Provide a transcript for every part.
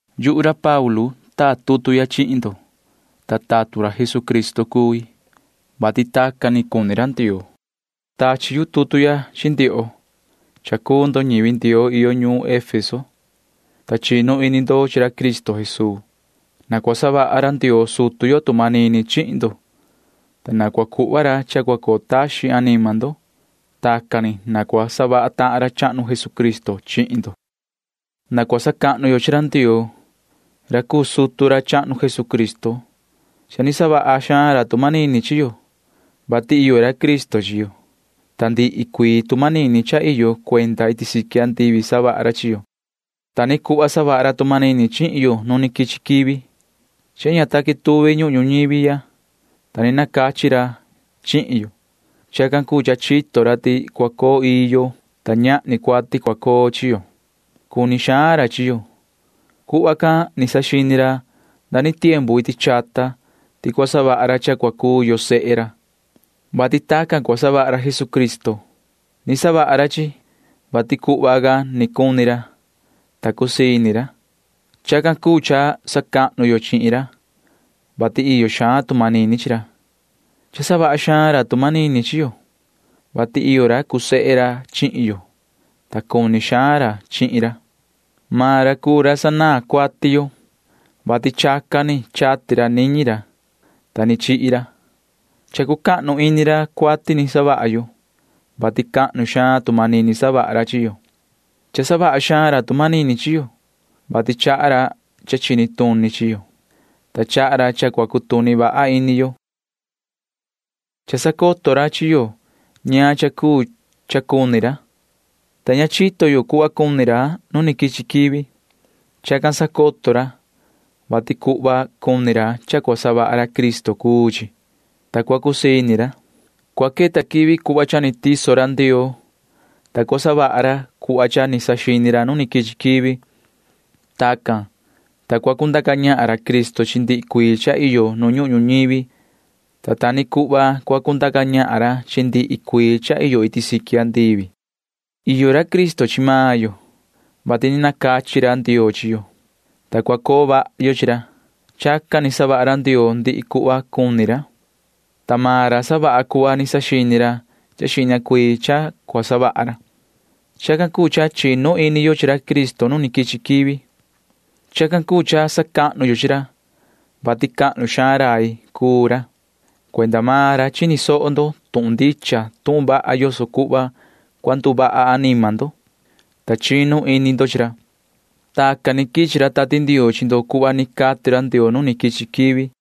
Yuhu ra Paulu taa tutu ya chihin ndo, ta tatun ra Jesucristo cui, vati tacan ni cuni ra Ndioo. Tachi yu tutu ya chi ndioho. Ñivi Ndioo iyo ñuun Efeso cuu ndo, ta chinu ini ndo chi ra Cristo Jesuu. Na cua savaha ra Ndioo sutu yo tu manini chihin ndo, ta na cua cuhva ra cha cua coo taxin anima ndo. Chacan ni na cua savaha tahan ra chahnu Jesucristo chihin ndo. Na cua sacahnu yo chi ra Ndioo, ta sutu ra chahnu Jesucristo cuu ra. Cha ni savaha xaan ra tu manini chi yo, vati iyo ra Cristo chi yo, ta ndihi cuii tu manini cha iyo cuenda iti siqui andivi savaha ra chi yo. Ta ni cuhva savaha ra tu manini chihin yo nu quichi quivi, vati ña ta quetuvi ñuhun ñuñivi ya, ta ni nacachi ra chihin yo. Chacan cuu cha chito ra ti cua coo ii yo, ta ñahni cuati cua coo chi yo. Cuni xaan ra chi yo. Tacan ni saxini ra iti chata ti cua savaha ra cha cua cuu yo sehe ra, vati chacan ni cua savaha ra Jesucristo. Chacan ni savaha ra, vati tacan ni cuni ra, ta cua cusii ini ra. Chacan cuu cha sacahnu yo chihin ra, vati iyo xaan tu manini chi ra. Cha savaha xaan ra tu manini chi yo, vati iyo ra cuu sehe ra chihin yo, ta cuni xaan ra chihin ra. Maan ra cuu ra sanaan cuati yo, vati chacan ni chati ra niñi ra, ta ni chihi ra. Cha cucahnu ini ra cuati ni savaha yo, vati cahnu xaan tu manini savaha ra chi yo. Cha savaha xaan ra tu manini chi yo, vati chaha ra cha chini tuni chi yo, ta chaha ra cha cua cutuni vaha ini yo. Cha sacoto ra chi yo ñaan cha cuu cha cuni ra, ta ña chito yo cuhva cuni ra nu ni quichi quivi. Chacan sacoto ra, vati cuhva cuni maan ra cha cua savaha ra Cristo cuu chi, ta cua cusii ini ra. Cua queta quivi cuhva cha ni tiso ra Ndioo, ta cua savaha ra cuhva ni saxini ra nu quichi quivi. Tacan cuu, ta cua cundaca ñahan ra Cristo chi ndihi cuii cha iyo nu ñuhun ñuñivi, ta ta ni cuhva cua cundaca ñahan ra chi ndihi cuii cha iyo iti siqui andivi. Iyo ra Cristo chi maan yo. Tacan ni nacachi ra Ndioo chi yo, [ta cua coo vaha yo chi ra]. Chacan ni savaha ra Ndioo ndihi cuhva cuni ra, ta maan ra savaha cuhva ni saxini xihna ra cha cua savaha ra. Chacan cuu cha chinu ini yo chi ra Cristo nu quichi quivi. Chacan cuu cha sacahnu yo chi ra, vati cha cahnu xaan rai cuu ra. Cuenda maan ra chini soho ndo tuhun ndicha tuhun vaha yoso cuhva cua nduvaha anima ndo, ta chinu ini ndo chi ra. Tacan ni quichi ra Tati Ndioo chi ndo cuhva ni cati ra Ndioo nu ni quichi quivi.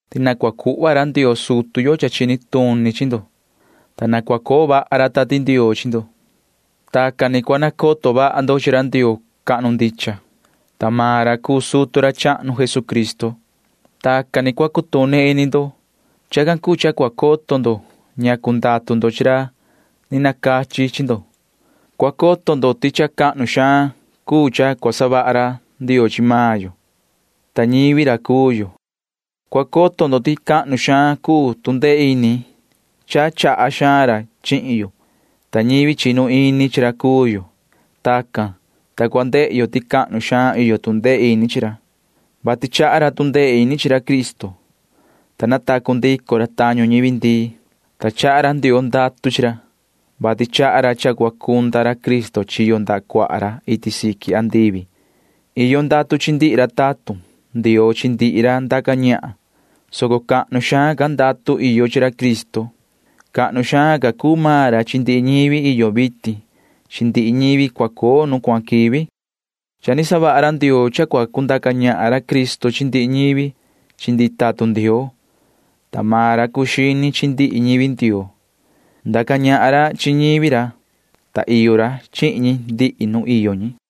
ti na cua cuhva ra Ndioo sutu yo cha chini tuni chi ndo, ta na cua coo vaha ra Tati Ndioo chi ndo. Tacan ni cua nacoto vaha ndo chi ra Ndioo cahnu, ta maan ra cuu sutu ra chahnu Jesucristo. Tacan ni cua cutuni ini ndo. Chacan cuu cha cua coto ndo ñacu ndatu ndo chi ra ni nacachi chi ndo. Cua coto ndo ti cha cahnu xaan cuu cha cua savaha ra Ndioo chi maan yo, ta ñivi ra cuu yo. Cua coto ndo ti cahnu xaan cuu tu ndee ini cha chaha xaan ra chihin yo, ta ñivi chinu ini chi ra cuu yo. Tacan ni, ta cua ndehe yo ti cahnu xaan iyo tu ndee ini chi ra, vati chaha ra tu ndee ini chi ra Cristo, ta natacu ndico ra tañu ñivi ndii, [ta chaha ra Ndioo ndatu chi ra,] vati chaha ra cha cua cunda ra Cristo chiyo ndaha cuaha ra iti siqui andivi. Iyo ndatu chi ndihi ra tatun Ndioo chi ndihi ra ndaca ñahan, soco cahnu xaan ca ndatu iyo chi ra Cristo. Cahnu xaan ca cuu maan ra chi ndihi ñivi iyo quivi vitin chi ndihi ñivi cua coo nu cuahan quivi. Cha ni savaha ra Ndioo cha cua cundaca ñahan ra Cristo chi ndihi ñivi chi ndihi tatun Ndioo, ta maan ra cuu xini chi ndihi ñivi Ndioo. Ndaca ñahan ra chi ñivi ra, ta iyo vaha ra chi ndihi ñi ndihi nu iyo ñi.